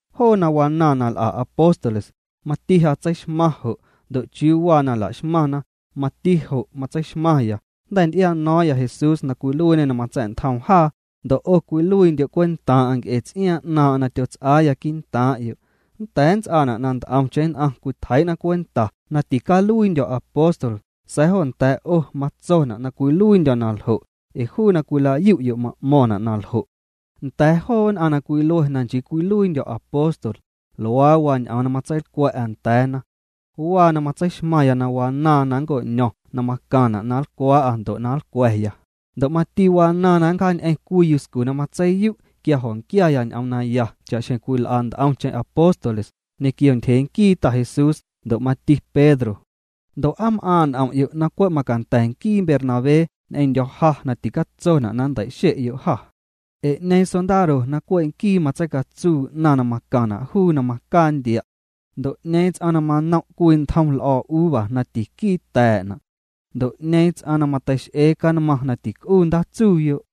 Joo na wanaaⁿ na l'a apóstoles, mati ja tseixmaⁿ jo' ndo' chiuu waa na laxmaⁿna, mati jo' matseixmaⁿya. Jnda̱ nty'iano̱o̱ⁿya Jesús na cwiluiiñê na matsa̱'ntjoom jaa, ndo' 'o cwiluiindyo' cwentaaⁿ'aⁿ nc'e ts'iaaⁿ 'naaⁿ'aⁿ na tyots'aaya quii'ntaaⁿ'yo'. Nnda̱a̱ nnts'aana' na nt'omcheⁿ nn'aⁿ cwitjeii'na cwenta na ticaluiindyo̱ apóstol, sa̱a̱ jo nda̱a̱ 'o matsona' na cwiluiindyo̱ na ljo' ee juu na cwila'yu'yo' ma'mo̱ⁿna' na ljo'. Nda̱a̱ joo nn'aⁿ na cwilue na nchii cwiluiindyo̱ apóstol, luaa waa ñ'oom na matseilcwa̱'a nda̱a̱na. Waa na matseixmaⁿya na wanaaⁿ na nnco'ño̱ⁿ na macaⁿna' na nlcwaa'a ndo' na nlcwa̱ya, ndo' mati wanaaⁿ na nncjaañ'eⁿ cwii yuscu na matseiyu' quia jo̱nquiaya ñ'oom naya cha'xjeⁿ cwil'a nt'omcheⁿ apóstoles, ñequio ntyjee nquii Ta Jesús ndo' mati Pedro. Ndo' ¿aa m'aaⁿ' n'om'yo' na cwe' macanda̱ nquii Bernabé ñ'eⁿndyo̱ ja na ticatsona' na nnteixe'yo' jâ? Ee ¿'ñeeⁿ sondaro na cwe' nquii matseicatsuu 'naⁿ na macaⁿna' juu na macaa ndia'? Ndo' ¿'ñeeⁿ ts'aⁿ na manom' cwii ntjom l'o̱o̱ uva na tiquii ta̱a̱'na'? Ndo' ¿'ñeeⁿ ts'aⁿ na mateix'e canmaⁿ na tic'uu ndaatsuuyo'?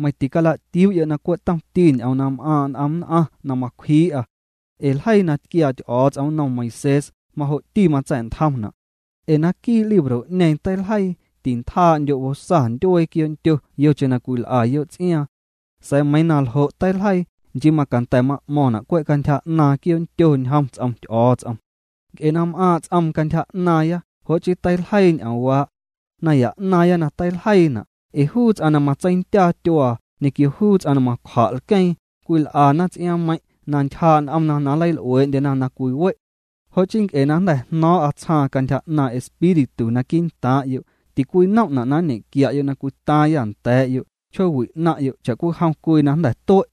Meiⁿ ticala'tiuu'yo' na cwe' tomti ñ'oom na m'aaⁿ' n'om nn'aⁿ na macwjii'a. Ee ljeii na tquiaa Ty'o̱o̱ts'om nnom Moisés, majo'ti matsa̱'ntjomna'. Ee naquii' libro'ñeeⁿ teiljeii: “Tintjaa'ndyo' bosa ndyuee quioo'ndyo yocheⁿ na cwil'a'yo' ts'iaaⁿ.” Sa̱a̱ meiiⁿ na ljo' teiljeii, nchii macanda̱ ma'mo̱ⁿna' na cwe' cantyja 'naaⁿ quioo'ndyo ñjom ts'om Ty'o̱o̱ts'om. Nc'e na m'aaⁿ' ts'oom cantyja 'naaⁿya, jo' chii teiljeii ñ'oomwaa'. Naya 'naaⁿya na teiljeiina', ee juu ts'aⁿ na matseindyaa tyuaa ñequio juu ts'aⁿ na macwja' lqueeⁿ, cwil'ana ts'iaaⁿmeiⁿ' na ntyjaa' n'omna na nleil'uee'ndyena na cwiwe'. Jo' chii nc'e na jnda̱ jno̱o̱ⁿ'â tsjaaⁿ cantyja 'naaⁿ' Espíritu naquii' ntaaⁿ'yo', ticwinom'na' na nñequia'yo' na cwitaaⁿyâ nda̱a̱yo' chjoowi' 'naⁿ'yo' cha'cwijom cwii na jnda̱ tue'.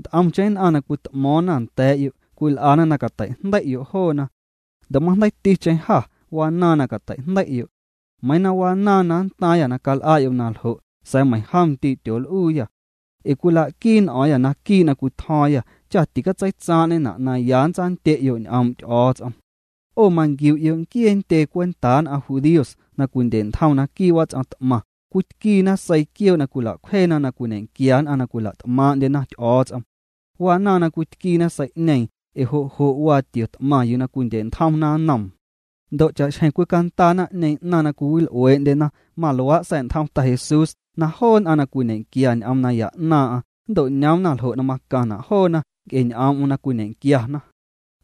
Nt'omcheⁿ nn'aⁿ na cwit'mo̱o̱ⁿ nda̱a̱'yo' cwil'ana na cateijndei'yo' joona. Ndo' majndeiiticheⁿ jâ wanaaⁿ na cateijndei'yo'. Meiiⁿ na wanaaⁿ na ntaaⁿyâ na cal'a'yo' na ljo', sa̱a̱ meiⁿjom ndii' tyool'uuyâ. Ee cwila'quii n'o̱o̱ⁿyâ naquii' na cwitjo̱o̱ⁿyâ cha ticatseitsaaⁿ'ñena' na ya tsandye'yo' ñ'oom' Ty'o̱o̱ts'om. 'O manquiu'yo' nquiee ntyee cwentaa nn'aⁿ judíos na cwindye'ntjom naquii' wats'om t'maⁿ cwitquiina seii quioo' na cwila'cwjeena na cwiñequia nn'aⁿ na cwila't'maaⁿ'ndyena Ty'o̱o̱ts'om. Wanaaⁿ na cwitquiina sei'ñeeⁿ ee jo' jo' waa tio t'maⁿ yuu cwindye'ntjomna nnoom. Ndo' cha'xjeⁿ cwicandaa naⁿ'ñeeⁿ 'naⁿ na cwiwil'uee'ndyena, maluaa' sa̱'ntjom Ta Jesús na joo nn'aⁿ na cwiñe'quia ñ'oom naya 'naaⁿ'aⁿ nnto'ñoomna ljo' na macaⁿna' joona nc'e ñ'oom'm na cwiñe'quiana.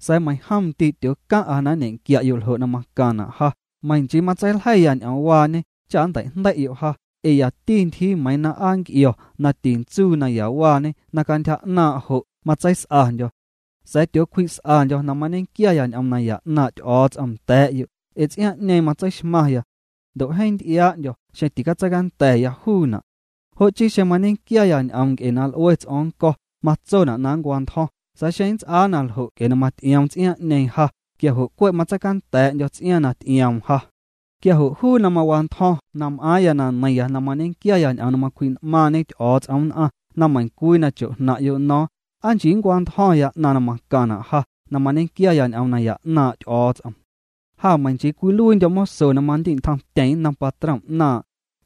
Sa̱a̱ meiⁿjom ndii' tyoocaⁿ'a na nñequia'yo' ljo' na macaⁿna' ja, meiⁿ nchii matseiljeiya ñ'oomwaañe cha nnteijndei'yo' ja. Ee yati ntyjii meiiⁿ na aa nc'io̱ na tintsuu nayawaañe na cantyja 'naaⁿ' jo' matseis'andyo̱. Sa̱a̱ tyoocwji's'andyo̱ na mañequiaya ñ'oom naya 'naaⁿ' Ty'o̱o̱ts'om nda̱a̱'yo' ee ts'iaaⁿ'ñeeⁿ matseixmaⁿya. Ndo' jeeⁿ nty'iaa'ndyo̱ xeeⁿ ticatseicanda̱ya juuna'. Jo' chii xeⁿ mañequiaya ñ'oom nc'e na l'ue ts'o̱o̱ⁿ nnco̱, matsona' na nncwantjo̱ⁿ, sa̱a̱ xeⁿ mats'aa na ljo' nc'e na maty'ioom ts'iaaⁿ'ñeeⁿ ja, quia jo' cwe' matseicanda̱a̱'ndyo̱ ts'iaaⁿ na ty'ioom ja. Quia jo' juu na mawantyjo̱ⁿ, na m'aaⁿya na neiⁿya na mañequia ñ'oom na macwji'n'maaⁿñe Ty'o̱o̱ts'om nn'aⁿ na meiⁿcwii na chojnaⁿ'yo' no̱o̱ⁿ, na nchii nncwantjo̱ⁿya 'naⁿ na macaⁿna' ja na mañequiaya ñ'oom naya 'naaⁿ' Ty'o̱o̱ts'om. Ja meiiⁿ nchii cwiluiindyo̱ moso na mandi'ntjomtyeⁿ nnom patrom 'naaⁿ',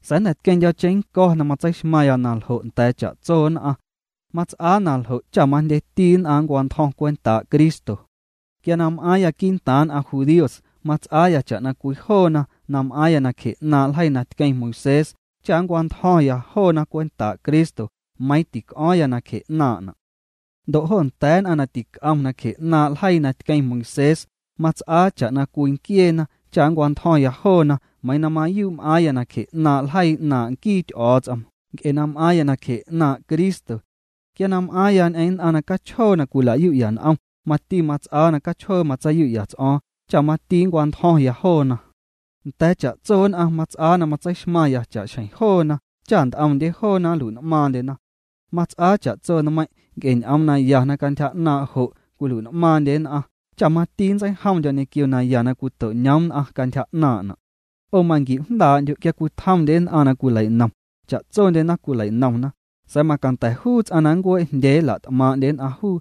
sa̱a̱ jnda̱ tqueⁿndyo̱ cheⁿnnco̱ na matseixmaⁿya na ljo' nda̱a̱ cha'tso nn'aⁿ. Mats'aa na ljo' cha majndyeti nn'aⁿ nncwantjo̱ⁿ cwentaa' Cristo. Quia na m'aaⁿya quii'ntaaⁿ nn'aⁿ judíos, mats'aa cha'na cwii joona na m'aⁿna nacje 'naaⁿ' ljeii na tquiaa Moisés cha nncwantjo̱ⁿya joona cwentaa' Cristo, meiiⁿ tic'o̱o̱ⁿya nacje 'naaⁿ'na'. Ndo' jo nda̱a̱ nn'aⁿ na tic'omna nacje 'naaⁿ' ljeii na tqueⁿ Moisés, mats'aa cha'na cwii nquieena cha nncwantjo̱ⁿya joona, meiiⁿ na mayuu' m'aaⁿya nacje 'naaⁿ' ljeii 'naaⁿ' nquii Ty'o̱o̱ts'om nc'e na m'aaⁿya nacje 'naaⁿ' Cristo. Quia na m'aaⁿya ñ'eⁿ nn'aⁿ na cachjoo na cwila'yu'ya n'om, mati mats'aa na cachjoo matseiyu'ya ts'o̱o̱ⁿ cha mati nncwantjo̱ⁿya joona. Nda̱a̱ cha'tso nn'aⁿ mats'aa na matseixmaⁿya cha'xjeⁿ joona cha nt'omndye joona nlui'n'maaⁿndyena. Mats'aa cha'tso nmeiⁿ' nc'e ñ'oom naya na cantyja 'naaⁿ' jo' cwilui'n'maaⁿndye nn'aⁿ cha mati nntseijomndyo̱ ñequio naya na cwito'ñoom nn'aⁿ cantyja 'naaⁿ'na'. 'O manquiu'jndaa'ndyo' quia cwitjomndye nn'aⁿ na nleinom, cha'tsondyena cwileinomna, sa̱a̱ macanda̱ juu ts'aⁿ na nncuee'jndyee nla't'maaⁿ'ndye nn'aⁿ juu.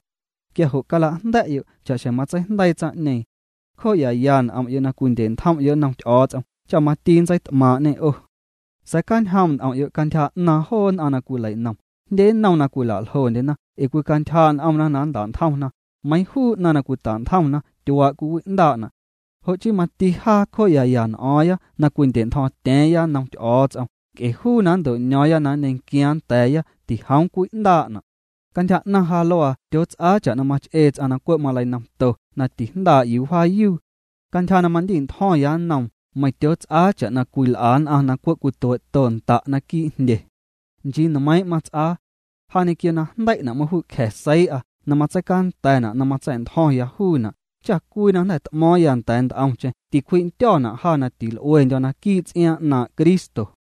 Quia jo' cala'jnda̱'yo' cha'xjeⁿ matseijndeii tsaⁿ'ñeeⁿ. Cjoo'yaya n'om'yo' na cwindye'ntjom'yo' nnom Ty'o̱o̱ts'om cha mati nntseit'maaⁿ'ñê 'o. Sa̱a̱ cjaañjoom' n'om'yo' cantyja 'naaⁿ joo nn'aⁿ na cwileinom, jndye nnom na cwila'ljondyena, ee cwicantyjaa' n'omna na nnta'ntjomna, meiiⁿ juu 'naⁿ na cwita'ntjomna tyuaa' cwiwi'ndaa'na'. Jo' chii mati jaa cjoo'yaya n'o̱o̱ⁿya na cwindya̱'ntjo̱o̱ⁿtya̱a̱ⁿya nnom Ty'o̱o̱ts'om nc'e juu na nnto'ño̱o̱ⁿya na nñequiaaⁿ nda̱a̱ya tijoom cwi'ndaa'na'. Cantyja 'naⁿ ja luaa tyoots'aa cha'na mach'ee ts'aⁿ na cwe' maleinomto na tijndaa' yuu wjaayuu. Cantyja na mandi'ntjo̱ⁿya nnoom, meiⁿ tyoots'aa cha' cwil'a nn'aⁿ na cwe' cwituee'to nnda' naquii' jndye. Nchii nmeiiⁿ' mats'aa. Ja ñequio na jndei'na' maju'cja̱ seii'a na catseicanda̱na' na matsa̱'ntjo̱ⁿya juuna', cha cwii na jnda̱ t'mo̱o̱ⁿya nda̱a̱ nt'omcheⁿ ticwji'ndyo̱na' ja na ticwil'uendyo̱ naquii' ts'iaaⁿ 'naaⁿ' Cristo.